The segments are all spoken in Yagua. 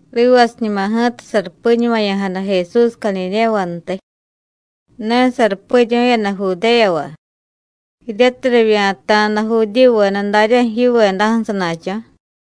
Rivasiñuma ji̱ta sarupiñumaya̱jada Jesús Cadidéyavantiy. Ne sarupiryu̱yada Judéyava jiryatiy rivya̱ta̱da Judíyuveda daryaju̱ yivedaju̱ sana̱cho̱.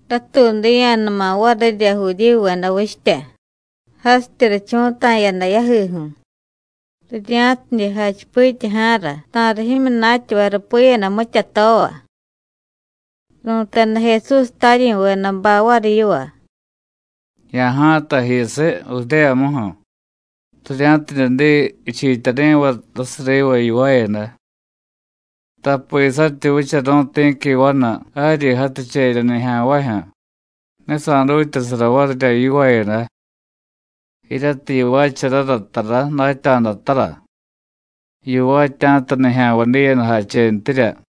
Ratuudiya̱numa varirya Judíyuveda vichtya, jasityi richu̱ta̱yada yajiju̱, rirya̱tidye jachipityaja̱ra ta̱riy jimyunatyavay rupiyada mityatova. Ru̱teda Jesús taryi̱vedabay variy yiva: “Ya̱ja̱tay jiyusiy Judéyamuju̱, rirya̱tidye diy jichiityari̱vay jasiy riva yivaayada. Tapi saryityi vicharu̱y ti̱qui vanu jaryi jaticherya nijya̱nvajyu̱, ne sa̱dutyasara varirya yivaayada. Jiryatiy yivaacharara tara, datya̱da tara, yivaatya̱ta nijya̱nvay diyadajachentirya.”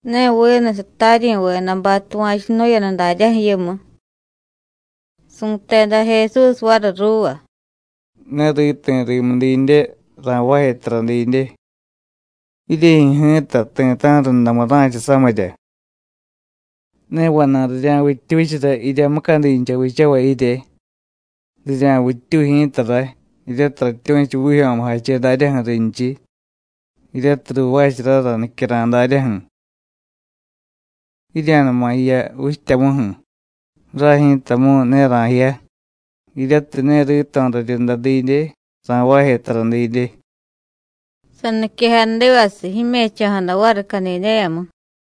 Ne vinu sataryi̱vedabay tuva̱chunu̱yada daryaju̱ yimu. Su̱teda Jesús variy ruuva: “Ne riti̱ rimu didye ra̱jvaaje tara didye. Jiryejyu̱ ji̱ta ti̱ta̱ju̱ rundamu ra̱cha samirya. Ne vana̱y rirya̱vittyuchara jirya mucadincha vichavay jirye. Rirya̱vittyuy ji̱ta ray, jiryatiy ratyu̱chu vijyo̱mujache daryaju̱ rinchiy, jiryatiy ruuvaacharara nicyara̱y daryaju̱. Jirya̱numa jiya vichtyamuju̱. Ray ji̱tamu̱y ne ra̱jiya, jiryatiy ne rito̱ raryunda didye, ra̱jvaaje tara didye.” Saniquejadivasiy, jime̱cho̱jada variy Cadidéyamu.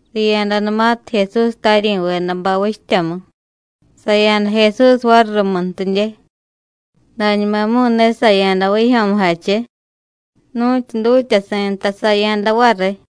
Riya̱danumatiy Jesús taryi̱vedabay vichtyamu, saya̱da Jesús variy rumuntidye, dañumamu̱y ne saya̱da vijyo̱mujache. Nu̱tyu dutyasi̱ nta saya̱da variy.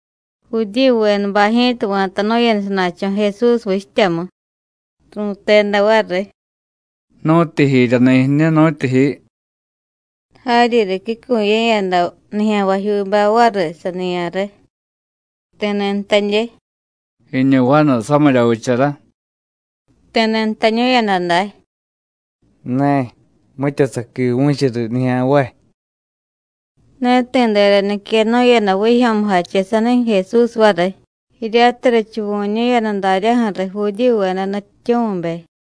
Judíyuvedabay ji̱ta va̱tanu̱yada sana̱cho̱ Jesús vichtyamu, ru̱teda variy: “¿Nu̱tyijiryani̱ jiñu, nu̱tyijiy?” Jaryi ricyucuye̱yada nijya̱nvajyuubay variy saniya̱re. Ti̱ni̱ jtadye: “Jiñu vanu samirya vichara.” Ti̱ni̱ jtañu̱yada day: “Ne, mitya saquivu̱chu riy nijya̱nvay.” Ne ti̱dera niquenu̱yada vijyo̱mujache sanijyu̱ Jesús variy, jiryatiy richuvu̱ñu̱yada daryaju̱ riy Judíyuveda nutyityu̱mibe.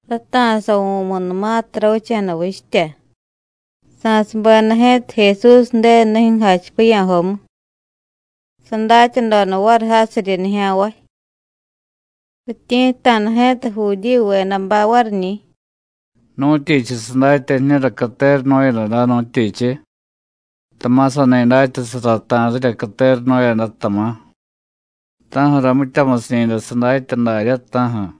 Rata̱savu̱munumatiy ravicha̱da vichtya, sa̱subeda ji̱ta Jesús Ju̱denu nijyu̱ jachipiya̱jomu, sadatyadoda variy jasiryi nijya̱nvay. Rityi̱tta̱da ji̱ta Judíyuvedabay variñi̱: “¿Nu̱tyichiy sadatya jiñura catera nu̱yada day, nu̱tyichiy? Tama̱ sani datyasara ta̱rirya catera nu̱yada, tama̱. ¿Ta̱ju̱ra mityamusiñi̱day sadatya daryá, ta̱ju̱?”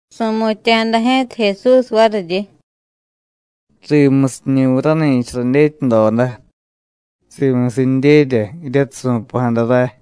Su̱mutya̱jada ji̱ta Jesús variryi: “Rimusiñi̱viy rani̱cha radyetyadoda; simusindyerya jiryatiy su̱pa̱jada ray.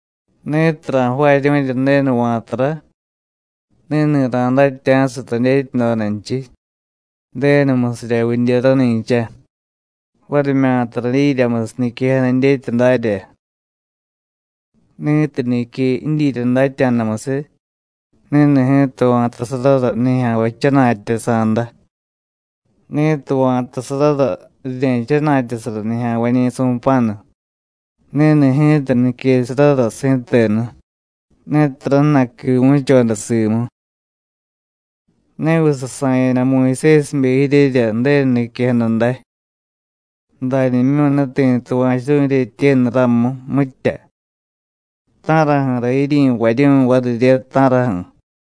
Ni̱tiy ra̱jvaaryu̱rya Ju̱denu va̱tara, ni̱ni̱ ra̱datya̱siy radyetyadodanchiy, Ju̱denumusirya vidye rani̱cha, varimyata radyiryamusiy niquejada dyetya darya. Ni̱tiy nique jidyirya datya̱damusiy, ni̱ni̱ ji̱ta va̱tasarara nijya̱nvay jchana̱tyasa̱da. Ni̱tiy va̱tasarara rirye̱jchana̱tyasara nijya̱nvañi̱ su̱pa̱nu, ni̱ni̱ ji̱ta niquesarara si̱tenu, ne tara jna̱y quivu̱choda simu. ¿Neviy sasa̱yada Muyusésibe jiryerya Ju̱denu niquejada day? Dañimyu̱ ne ti̱ tuva̱churu̱y jiryetyenu ramu, mitya. ¿Ta̱raju̱ra jiryi̱varyu̱y varirye, ta̱raju̱?”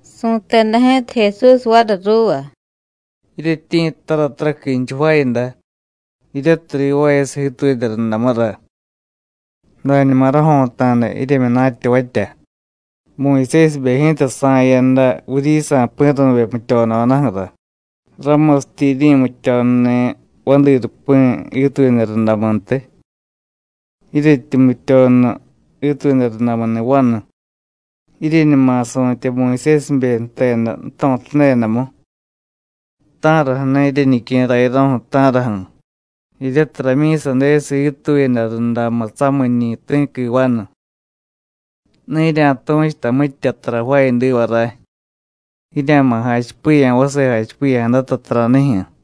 Su̱teda ji̱ta Jesús variy ruuva: “Jiryetyi̱ttara taraquinchiy jvaayada, jiryatiy rivaayasiy jiituyada rundamura. Dañuma rajo̱ta̱da jiryemyunatyavatya, Muyusésibe ji̱ta sa̱yada vuryisa̱ pi̱ru̱vye jmutyododaju̱ra, ramusityi jiryi̱mutyonuni̱ vadi rupi̱ jiituyada rundamuntiy. Jiryetyi jmutyonu jiituyada rundamuni̱ vanu, jiryeñuma su̱tye Muyusésibe jteda jto̱tadedamu, ¿ta̱raju̱na̱ jiryeñique̱ rayaro̱ju̱, ta̱raju̱? jiryatiy ramyi̱sadesiy jiituyada rundamu samiñi̱ ti̱qui vanu. Ne jirya̱tu̱chuta mitya tara jvaayadiva ray; jirya̱ma̱ jachipiya̱ vase jachipiya̱jadata taranijyu̱.”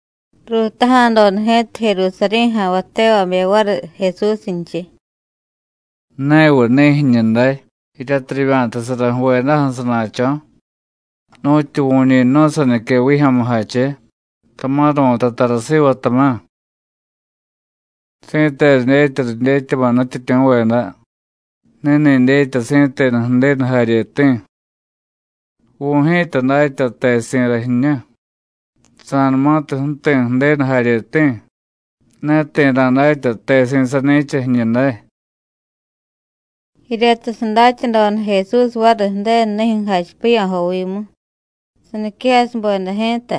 Ruutaja̱doda ji̱ta Jerusarí̱ ja̱nvay tevabe variy Jesúsnchiy: “¿Neviy ni̱ jiñu day jiryatiy rivya̱tasara ju̱vedaju̱ sana̱cho̱? ¿Nu̱tyu vu̱ñi jnu̱y sanique vijyo̱mujache, tama̱ ru̱tay tara siva, tama̱? Si̱tenu dyetya ridyetyama̱ nutyityu̱veda: Ni̱ni̱ dyetya si̱tenu Ju̱denu jaryeti̱. Vu̱y ji̱ta datya tesi̱ra jiñu. Sa̱numatiy ju̱ti̱ Ju̱denu jaryeti̱, ne ti̱ ra̱datya tesi̱ sani̱cha jiñu day.” Jiryatiy sadatyadoda Jesús variy Ju̱denu nijyu̱ jachipiya̱jovimu, saniquejasubeda ji̱ta: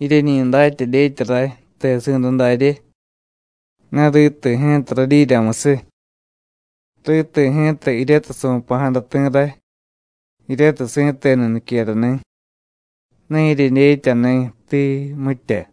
“Jiryeñi datya dyetya ray, tesi̱ra darye. Ne riti̱ ji̱ta radyiryamusiy. Riti̱ ji̱ta jiryatiy su̱pa̱jada ti̱ ray, jiryatiy si̱tenu niquerani̱. Ne jiryedyetyani̱, tii, mitya.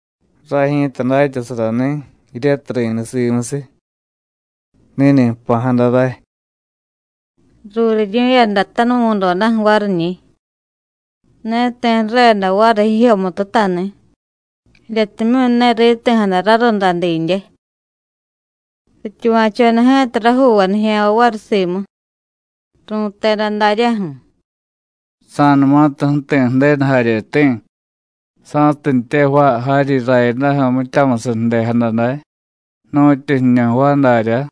Ray ji̱ta datyasarani̱ jiryatiy ri̱niy simusiy. Ni̱ni̱ jpa̱jada ray.” Ruuriryu̱yada tanuvu̱dodaju̱ variñi̱, ne ti̱ ju̱reda variy jijyomututani̱, jiryatimyu̱ ne riti̱jada rarunda didye. Rityuva̱choda ji̱ta rajuuvay nijya̱nvay variy simu, ru̱teda daryaju̱: “Sa̱numatiy ju̱ti̱ Ju̱denu jaryeti̱ ¿sa̱tintye jvaay jaryi rayadaju̱ mityamusiy ju̱dejada day, nu̱tyu jiñu jvaay daryá?”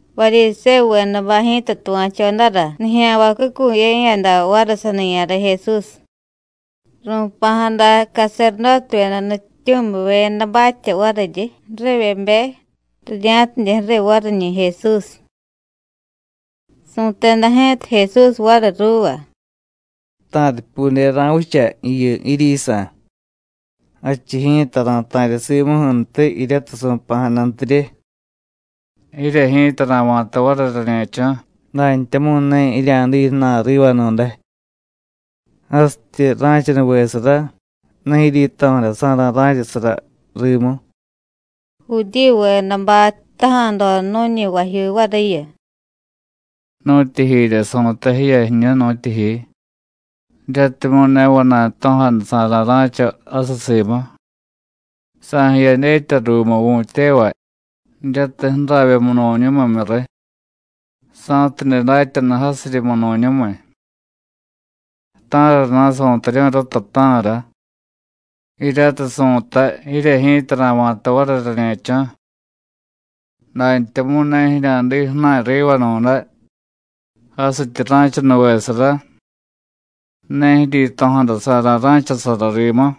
Varyisévuvedabay ji̱ta tuva̱chodara nijya̱nvay cucuye̱yada variy saniya̱re Jesús. Ru̱pa̱jada caserdótevyeda nutyityu̱mivyedabatya variryi ju̱rivyebe rirya̱tidye ju̱riy variñi̱ Jesús. Su̱teda ji̱ta Jesús variy ruuva: “Ta̱ripyude ra̱vicha jiyu jiryisa̱, jadchiy ji̱ta ra̱ta̱rya simuju̱ntiy jiryatiy su̱pa̱jadantirye. Jirye ji̱ta ra̱va̱ta variy rañe̱cho̱, dantyamu̱y ne jirya̱diy ju̱na̱y rivanu̱day. Jasityi ra̱chanuvesara, ne jiryito̱jadasa̱ra̱ ra̱chasara rimu.” Judíyuvedabay jtaja̱doda nu̱ñi vajyuu variyu: “¿Nu̱tyijirya su̱tay jiya jiñu, nu̱tyijiy? jiryatimyu̱ ne vana̱y jto̱jadasa̱ra̱ ra̱cha jasiy simu. ¿Sa̱jiya dyetya ruumu vu̱tyevay, jiryatiy ju̱ravye munu̱ñumimyu riy, sa̱tidye datyanu jasiryi munu̱ñumiy? ¿Ta̱rana̱ su̱taryu̱y rata, ta̱ra? jiryatiy su̱tay: Jirye ji̱ta ra̱va̱ta variy rañe̱cho̱, dantyamu̱y ne jirya̱diy ju̱na̱y rivanu̱day. Jasityi ra̱chanuvesara, ne jiryito̱jadasa̱ra̱ ra̱chasara rimu.”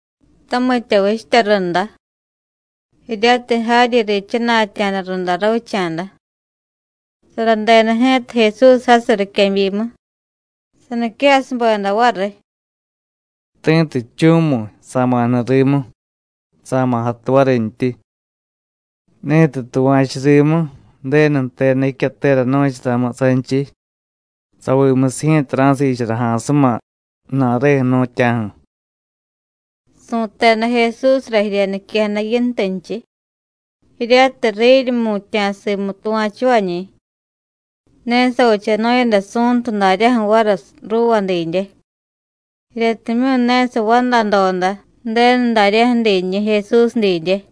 Tamitya vichtya runda, jiryatiy jaryi riichana̱tya̱da runda ravicha̱da, saradeda ji̱ta Jesús jasiy riquebyimu, saniquejasubeda variy: “Ti̱tiy jchu̱mu̱y, sa̱ma̱ jniy rimu, sa̱ma̱ jatu varintyi. Ni̱tiy tuva̱chu rimu, Ju̱denu jteda jicyatera nu̱charamu sanchiy, savimusiy ji̱ta ra̱siichara ja̱a̱suma ju̱na̱reju̱ jnu̱tya̱ju̱.” Su̱teda Jesúsra jirya niquejada Yintunchiy, jiryatiy riryi jmutya̱ simu tuva̱chuvañi̱. Ne savichanu̱yada Su̱ntu daryaju̱ variy ruuva didye, jiryatimyu̱ ne savandadoda Ju̱denu daryaju̱ dinñi̱ Jesús didye.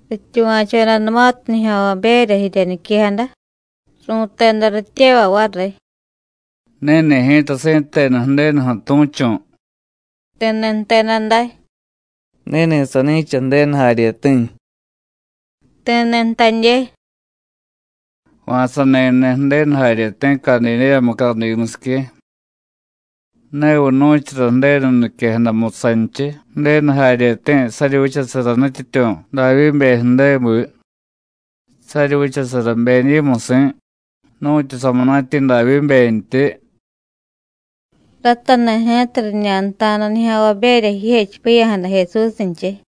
Rityuva̱chodanumatiy nijya̱nvaberya jirya niquejada, ru̱teda rityevay variy: “Ni̱ni̱ ji̱ta si̱tenu Ju̱denuju̱ tu̱chu̱.” Ti̱ni̱ jteda day: “Ni̱ni̱ sani̱cha Ju̱denu jaryeti̱.” Ti̱ni̱ jtadye: “¿Va̱ sani jniy Ju̱denu jaryeti̱ Cadidéya mucadimusique? ¿Ne viy nu̱chara Ju̱denu niquejadamu sanchiy Ju̱denu jaryeti̱ saryi vichasara nutyityu̱ Davyíbe ju̱débi, saryi vichasara Bení̱musi̱ nu̱tyu samunatyi̱ Davyíbentyi?” Ratani̱ ji̱ta riñanta̱da nijya̱nvaberya jijechipiya̱jada Jesúsnchiy.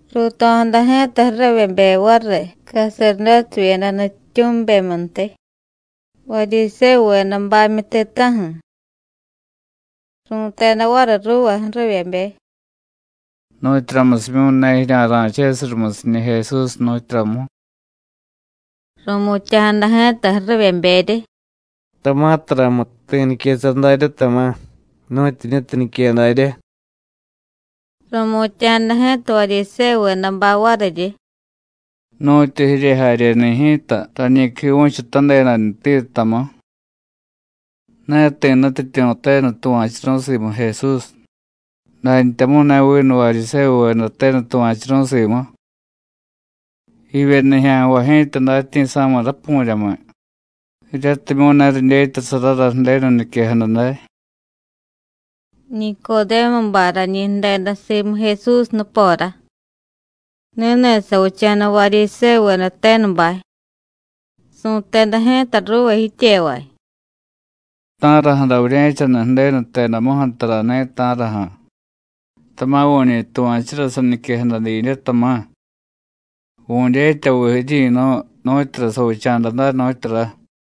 Ruuto̱jada ji̱ta ju̱rivyebe variy caserdótevyeda nutyityu̱mibemyuntiy, Varyisévuvedabamyu ti̱ta̱ju̱. Ru̱teda variy ruuva ju̱rivyebe: “¿Nu̱tyuramusimyu̱ ne jirya̱ra̱chesiy rumusiñi̱ Jesús, nu̱tyuramu?” Ru̱mutya̱jada ji̱ta ju̱rivyeberyi: “Tama̱ taramu̱y ti̱ niquesara daryá, tama̱, nu̱tyu jiñutiy nique daryá.” Ru̱mutya̱jada ji̱ta Varyisévuvedabay variryi: “¿Nu̱tyu jirye jaryeni̱ ji̱ta rañi quivu̱chutadedantiyu, tamú? Ne ti̱ nutyityu̱ tenu tuva̱churu̱y simu Jesús, dantyamu̱y ne vinu Varyisévuveda tenu tuva̱churu̱y simu. Jivye nijya̱nvay ji̱ta datyi̱sa̱miy rapu̱ryamiy, jiryatimyu̱ ne ridyetyasarara Ju̱denu niquejada day.” Nicodémubay rañi jdeda simu Jesús nupora, ni̱ni̱ savicha̱da Varyisévuveda tenubay. Su̱teda ji̱ta ruuva jityevay: “¿Ta̱raju̱ra vurye̱chaniy Ju̱denu jtedamuju̱ tarani̱, ta̱raju̱? Tama̱ vu̱ñi tuva̱chura saniquejada didye, tama̱. Vu̱dyetyaviy jiryi̱nu̱y nu̱tyura savicha̱da day, nu̱tyura.”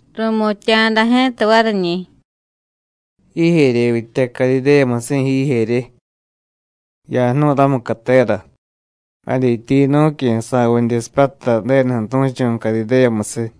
Ru̱mutya̱jada ji̱ta variñi̱: “¿Jijeryevyityá Cadidéyamusi̱, jijerye? Ya̱jnu̱y ramu catera, jadyitya yinu̱cyu̱ sa̱vidye sipyatay Ju̱denuju̱ tu̱chu̱ Cadidéyamusiy.”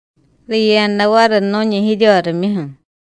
Riya̱da variy nu̱ñi jiryorimyuju̱.